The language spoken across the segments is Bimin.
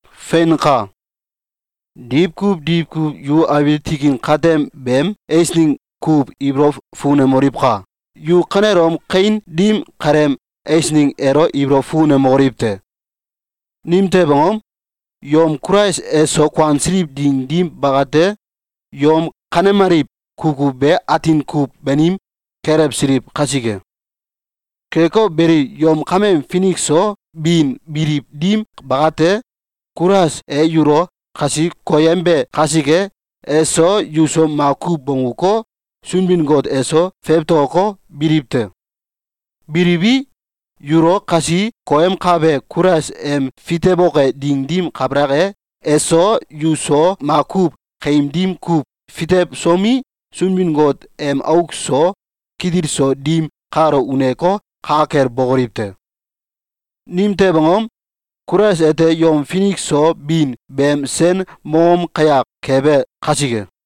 Feinka! Diwkuw diwkuw yu abiil tikin katem beem eisneng kuw ibolow fukunemoliwka! Yu kanelom kawin dim kaleem eisneng elo ibolow fukunemokoliw te! Nimtew angom? Yom Kulais eso kuansiliw ding dim bakate, yom kanemaliw kukuw be atin kuw banim kelewsiliw kasike. Keko beli, yom kameem finik so bin biliw dim bakate, Kulais e yulo kasi koyembe kasike, eso yuso makuw bongguko, Sunbin-Got eso fewtokoko, biliw te. Biliwi, yulo kasi koyemkabe Kulais em fitewoke ding dim kabalak e, eso yuso makuw kaim dim kuw fitewsomi, Sunbin-Got em auk so kitil so dim kalo uneko, ka kel bokoliw te. Nimtew angom? Kulais ete yom finik so bin beem sen mongom kayak kebe kasike.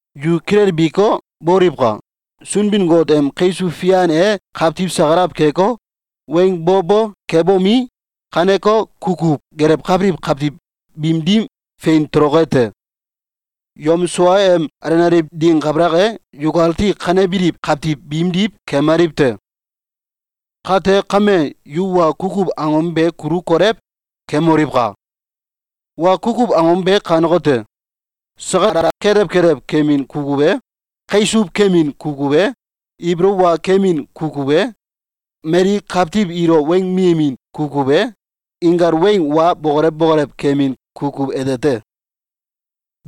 Yu kilelbiko, boliwka! Sunbin-Got em kaisuw fian e kawtiw sakalaw keko, weng bo bo kebomi, kaneko kukuw gelewkabiliw kawtiw biim dim fein toloke te. Yom sua em alenaliw ding kabalak e, yukati kanebiliw kawtiw biimdiw kemaliw te. Kate kame, yu wa kukuw angom be kulu kolew keemoliwka! Wa kukuw angom be kanekote: Sakalala kelew kelew kemin kukuw e, kaisuw kemin kukuw e, ibolow wa kemin kukuw e, mali kawtiw ilo weng miyemin kukuw e, inkal weng wa bokolew bokolew kemin kukuw ete te.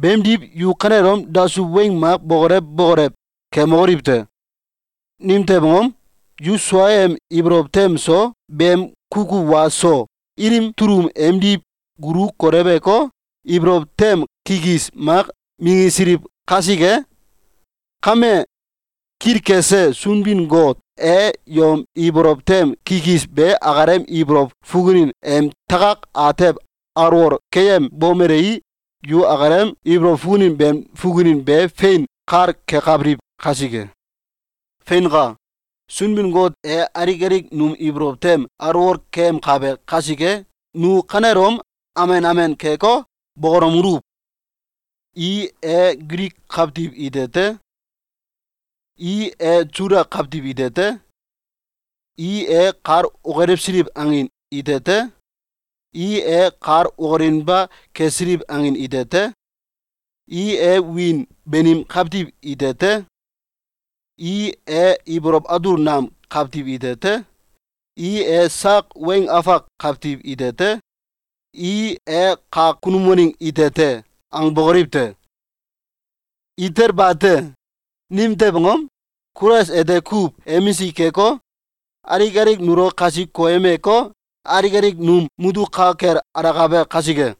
Beemdiw, yu kanelom dasuw weng mak bokolew bokolew kemokoliw te! Nimtew angom? Yu suaem ibolow tem so beem kukuw wa so ilim tulum emdiw gulu koleweko, ibolow tem kikis mak minggisiliw kasike. Kame, kilkese Sunbin-Got e yom ibolow tem kikis be akalem ibolow fukunin em takak atew alwol keyembomelei, yu akalem ibolow fukunin beem fukunin be fein kal kekabiliw kasike. Feinka! Sunbin-Got e alik alik num ibolow tem alwol keyemkabe kasike, nu kanelom amen amen keko, bokolomeluw: “I e Gilik kawtiw ite te. I e Suda kawtiw ite te. I e kal okilewsiliw angin ite te. I e kal okilinba kesiliw angin ite te. I e wiin banim kawtiw ite te. I e ibolow atul nam kawtiw ite te. I e sak weng afak kawtiw ite te. I e kak kunum waneng ite te!”, angbokoliw te! Itel bate! Nimtew angom? Kulais ete kuw emisik keko, alik alik nulo kasi koyemeko, alik alik num mutuk ka kel alakabe kasike.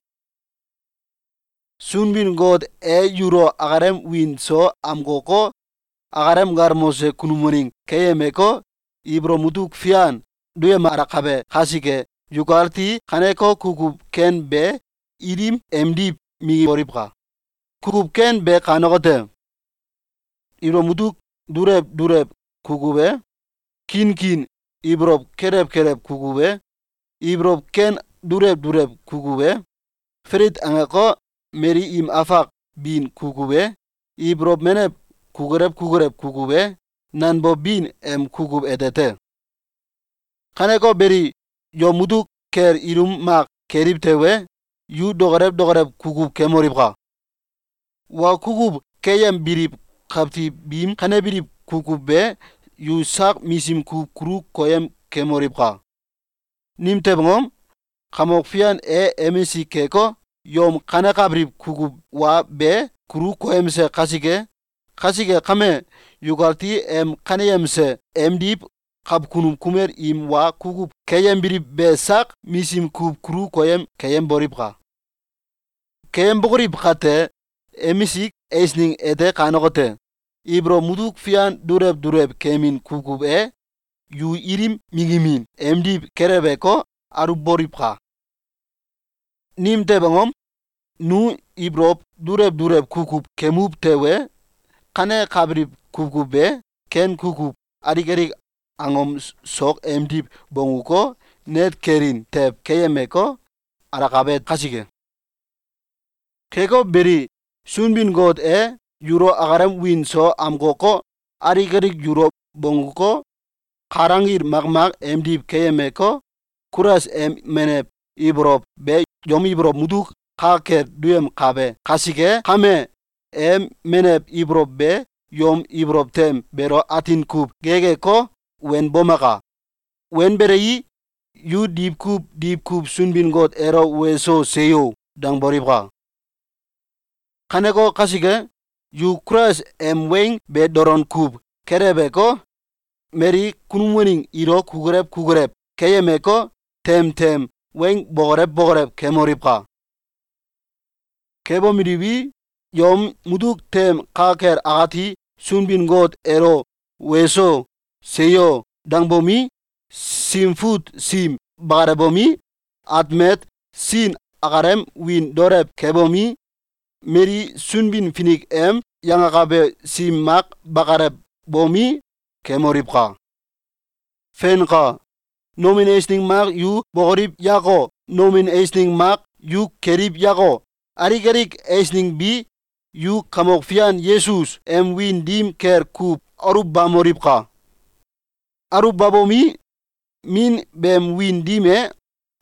Sunbin-Got e yulo akalem wiin so amkoko, akalem galmose kunum waneng keyemeko, ibolow mutuk fian duyemalakabe kasike, yukati kaneko kukuw ken be ilim emdiw minggiboliwka! Kukuw ken be kanekote: Ibolow mutuk dulew dulew kukuw e, kinkin ibolow kelew kelew kukuw e, ibolow ken dulew dulew kukuw e, falit angeko, mali im afak bin kukuw e, ibolow menew kukulew kukulew kukuw e, nanbow bin em kukuw ete te. Kaneko beli, yom mutuk kel ilum mak keliw tewe, yu dokolew dokolew kukuw kemoliwka! Wa kukuw keyembiliw kawtiw biim kanebiliw kukuw be yu sak misim kuw kulu koyem kemoliwka! Nimtew angom? Kamok Fian e emisik keko, yom kanekabiliw kukuw wa be kulu koyemse kasike! Kasike kame, yukati em kaneyemse emdiw kawkunum kumel im wa kukuw keyembiliw be sak misim kuw kulu koyem keyemboliwka! Keyembokoliw kate, emisik eisneng ete kanekote: Ibolow mutuk fian dulew dulew kemin kukuw e yu ilim minggimin emdiw keleweko, aluwboliwka! Nimtew angom? Nu ibolow dulew dulew kukuw kemuw tewe, kanekabiliw kukuw be ken kukuw alik alik angom sok emdiw bongguko, net kelin tew keyemeko, alakabe kasike. Keko beli, Sunbin-Got e yulo akalem wiin so amkoko, alik alik yulo bongguko, kal anggil makmak emdiw keyemeko, Kulais em menew ibolow be yom ibolow mutuk ka kel duyemkabe kasike kame, em menew ibolow be yom ibolow tem beelo atin kuw gekeko, wenbomaka! Wenbelei, yu diwkuw diwkuw Sunbin-Got elo “Weso! Seyo!”, dangboliwka! Kaneko kasike, yu Kulais em weng be dolon kuw keleweko, mali kunum waneng ilo kukulew kukulew keyemeko, tem tem weng bokolew bokolew kemoliwka! Kebomeliwi, yom mutuk tem ka kel akati Sunbin-Got elo “Weso! Seyo!”, dangbomi, Sim Fut sim bakalewbomi, atmet sin akalem wiin daolew kebomi, mali Sunbin-Finik em yangakabe sim mak bakalewbomi, kemoliwka! Feinka! Nomin eisneng mak yu bokoliw yako, nomin eisneng mak yu keliw yako, alik alik eisneng bi, yu Kamok Fian Yesus em wiin dim kel kuw aluwbamoliwka! Aluwbabomi, Min beem wiin dim e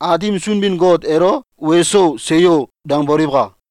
Aatim Sunbin-Got elo “Weso! Seyo!”, dangboliwka!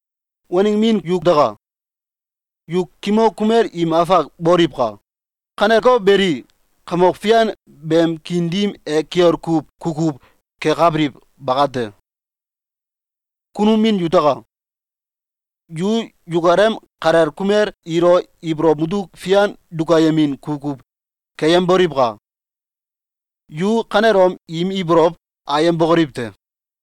Waneng min yutaka! Yu kimok kumel im afak boliwka! Kaneko beli, Kamok Fian beem kiin dim e kiol kuw kukuw kekabiliw bakate. Kunum min yutaka! Yu yukalem kalel kumel ilo ibolow mutuk fian dukayemin kukuw keyemboliwka! Yu kanelom im ibolow ayembokoliw te!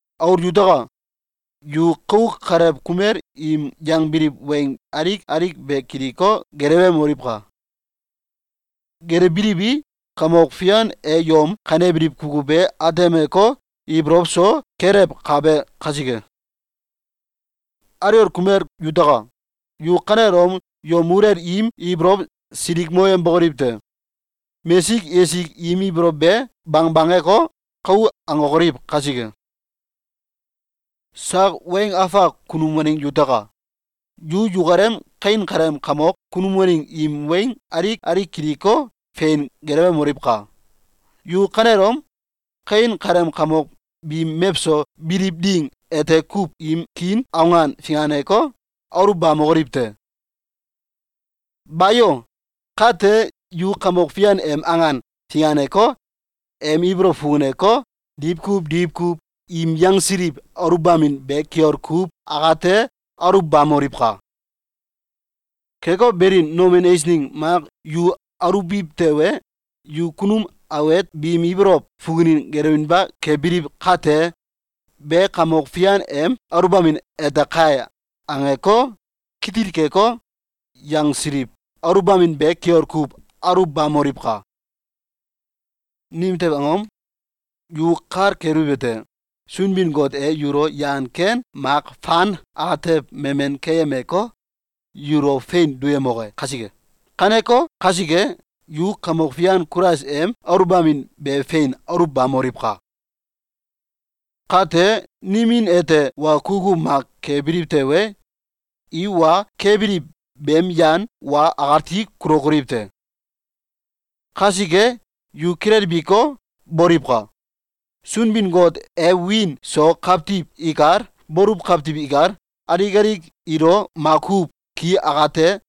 Aul yutaka! Yu kauk kalew kumel im yangbiliw weng alik alik be kiliko, gelewemoliwka! Gelewbiliwi, Kamok Fian e yom kanebiliw kukuw be atemeko, ibolow so kelewkabe kasike. Aliwol kumel yutaka! Yu kanelom yom muluwel im ibolow silikmoyembokoliw te! Mesik esik im ibolow be bangbangeko, kou angokoliw kasike. Sak weng afak kunum waneng yutaka! Yu yukalem kawin kaleem kamok kunum waneng im weng alik alik kiliko, fein gelewemoliwka! Yu kanelom kawin kaleem kamok biim mewso biliw ding ete kuw im kiin awan finganeko, aluwbamokoliw te! Bayo! Kate, yu Kamok Fian em awan finganeko, em ibolow fukuneko, diwkuw diwkuw im yangsiliw aluwbamin be kiol kuw akate aluwbamoliwka! Keko beli, nomin eisneng mak yu aluwbiw tewe, yu kunum awet biim ibolow fukunin gelewinba kebiliw kate, “Be Kamok Fian em aluwbamin ete kai!”, angeko, kitil keko, yangsiliw aluwbamin be kiol kuw aluwbamoliwka! Nimtew angom? Yu kal keliwete: Sunbin-Got e yulo yan ken mak fan atew memen keyemeko, yulo fein duyemoke kasike. Kaneko kasike, yu Kamok Fian Kulais em aluwbamin be fein aluwbamoliwka! Kate, nimin ete wa kukuw mak kebiliw tewe, i wa kebiliw beem yan wa akati kulokoliw te. Kasike, yu kilelbiko, boliwka! Sunbin-Got e wiin so kawtiw ikal, baluw kawtiw ikal, alik alik ilo makuw ki akate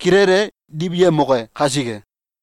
kilele diwyemoke kasike.